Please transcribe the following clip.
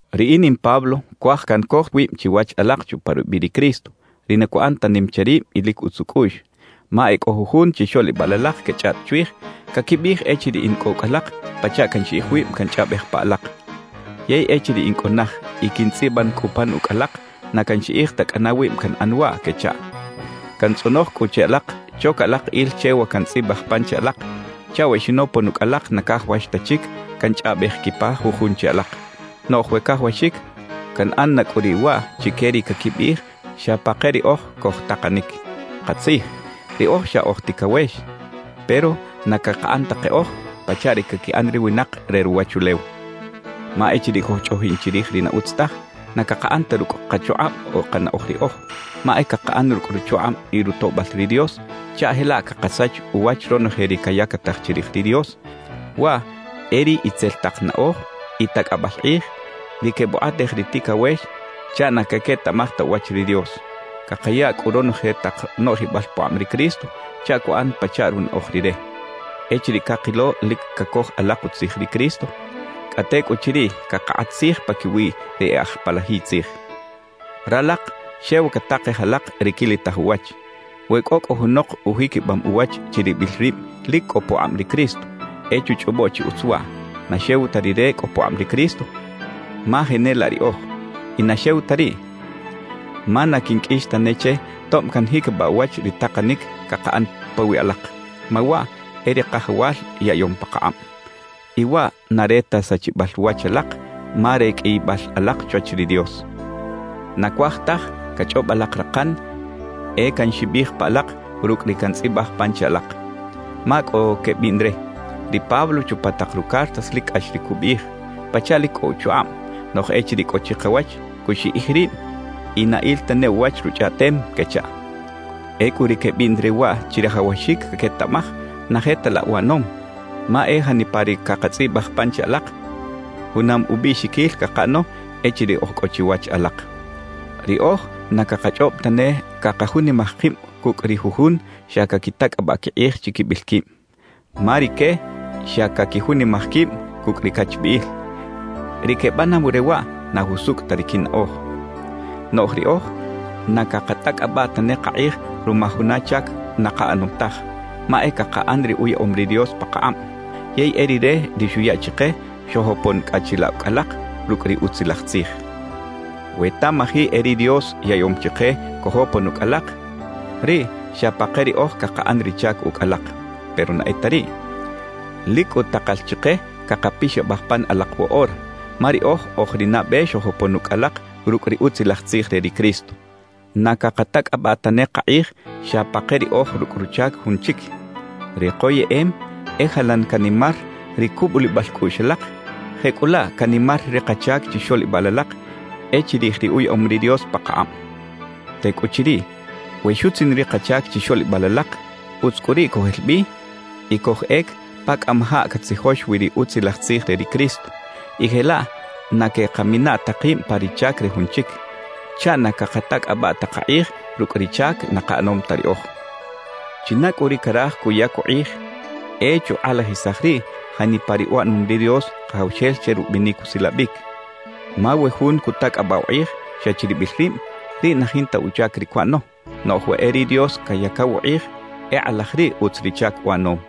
Riꞌin in Pablo cuaj cancoj wib chiwach alak chupa rubiꞌ ri Cristo, ri na cuꞌan ta nim che rib y lic utz ucꞌuꞌx. Ma e cꞌo jujun chixoꞌlibal alak quechꞌaꞌt chwij, caquibiꞌij echiriꞌ in cꞌo ucꞌ alak, pachaꞌ canxiꞌij wib canchꞌaꞌbej pa alak; yey echiriꞌ in cꞌo naj y quintzꞌiban cꞌu pan ucꞌ alak, na canxiꞌij ta cꞌana wib canꞌan waꞌ, quechaꞌ. Cantzꞌonoj cꞌu che alak choca alak il che wa cantzꞌibaj pan che alak, chaꞌ we xinopon ucꞌ alak na cajawax ta chic canchꞌaꞌbej quipa jujun che alak. Noꞌj we cajawaxic, canꞌan na cꞌu riꞌ waꞌ chique ri caquibiꞌij xa pa ke riꞌoj cojtakanic. Katzij, riꞌoj xa oj ticawex, pero na cakaꞌan ta keꞌoj pachaꞌ ri caquiꞌan ri winak re ruwachulew. Ma echiriꞌ cojchꞌoꞌjin chirij ri na utz taj, na cakaꞌan ta rucꞌ kachukꞌab o kanaꞌoj riꞌoj, ma e cakaꞌan rucꞌ ruchukꞌab y rutoꞌbal ri Dios chaꞌ jelaꞌ cakasach uwach ronoje ri cayactaj chirij ri Dios; waꞌ e ri itzel tak naꞌoj y tacꞌabal kꞌij, ri quebukꞌatej ri ticawex chaꞌ na caquetaꞌmaj ta uwach ri Dios. Cakaya cꞌu ronoje tak noꞌjibal pukꞌab ri Cristo chaꞌ cuꞌan pachaꞌ runaꞌoj Rire. Echiriꞌ cakilo lic cacoj alak utzij ri Cristo, cꞌa tecꞌuchiriꞌ cakakꞌat tzij paquiwi ri e aj palajiy tzij. Ralak xew catakej alak ri quilitaj uwach. We cꞌo cꞌu junok ujiquibam uwach chiribil rib lic cꞌo pukꞌab ri Cristo, e chuchꞌobo chi utz waꞌ: Na xew ta rire cꞌo pukꞌab ri Cristo, ma jenelaꞌ riꞌoj. Y na xew ta riꞌ, ma na quinqꞌuix tane che tob canjiquibaꞌ uwach ri takanic cakaꞌan pawiꞌ alak, ma waꞌ e ri Kajawal yaꞌyom pakakꞌab. Y waꞌ na re ta sachibal wach alak, ma re qꞌuiyibal alak chwach ri Dios. Na cuaj taj cachꞌob alak rakan e canxibij pa alak rucꞌ ri cantzꞌibaj pan che alak. Ma cꞌo quebiꞌn re: «Ri Pablo chupa tak rucartas lic cꞌax ri cubiꞌij, pachaꞌ lic cꞌo uchukꞌab; noꞌj echiriꞌ cꞌo chikawach, cuxiꞌij rib y na il tane uwach ruchꞌaꞌtem» quechaꞌ. Ecꞌu ri quebiꞌn re waꞌ chirajawaxic caquetaꞌmaj na je ta laꞌ uꞌanom, ma e janipa ri cakatzꞌibaj pan che alak, junam ubiꞌxiquil cakaꞌano echiriꞌ oj cꞌo chiwach alak. Riꞌoj na cakachꞌob tane cakajunimaj kib cucꞌ ri jujun xa caquitacꞌabaꞌ quikꞌij chiquibil quib. Ma rique xa caquijunimaj quib cucꞌ ri cachbiꞌil. Ri quebanaw re waꞌ, na jusucꞌ ta ri quinaꞌoj. Noꞌj riꞌoj na cakatacꞌabaꞌ tane kakꞌij ruma juna chac na kaꞌanom taj, ma e cakaꞌan ri uyaꞌom ri Dios pakakꞌab. Yey e Rire ri xuya chike xojopon cꞌa chilaꞌ ucꞌ alak rucꞌ ri Utzilaj Tzij. We tamaji e ri Dios yaꞌyom chike cojopon ucꞌ alak, riꞌ xa pa ke riꞌoj cakaꞌan ri chac ucꞌ alak. Pero na e ta riꞌ. Lic cꞌu takal chike cakapixabaj pan alak woꞌora, ma riꞌoj oj ri nabe xojopon ucꞌ alak rucꞌ ri Utzilaj Tzij re ri Cristo. Na cakatacꞌabaꞌ tane kakꞌij xa pa ke riꞌoj rucꞌ ruchac jun chic. Ri koyeꞌem e jalan canimar ri cubulibal cꞌuꞌx alak, jecꞌulaꞌ canimar ri kachac chixoꞌlibal alak e chirij ri uyaꞌom ri Dios pakakꞌab. Tecꞌuchiriꞌ we xutzin ri kachac chixoꞌlibal alak, utz cꞌu riꞌ cojel bi y cojꞌec pa cꞌamajaꞌ catzijox wi ri Utzilaj Tzij re ri Cristo, y jelaꞌ na queꞌkamina ta kib pa ri chac re jun chic, chaꞌ na cakatacꞌabaꞌ ta kakꞌij rucꞌ ri chac na kaꞌanom ta riꞌoj. China cꞌu ri caraj cuyac ukꞌij, e chukꞌalajisaj riꞌ janipa ri uꞌanom ri Dios Kajawxel che rubinic usilabic Ma we jun cutacꞌabaꞌ ukꞌij xa chiribil rib, riꞌ na jinta uchac ri cuꞌano; noꞌj we e ri Dios cayacaw ukꞌij, e kꞌalaj riꞌ utz ri chac uꞌanom.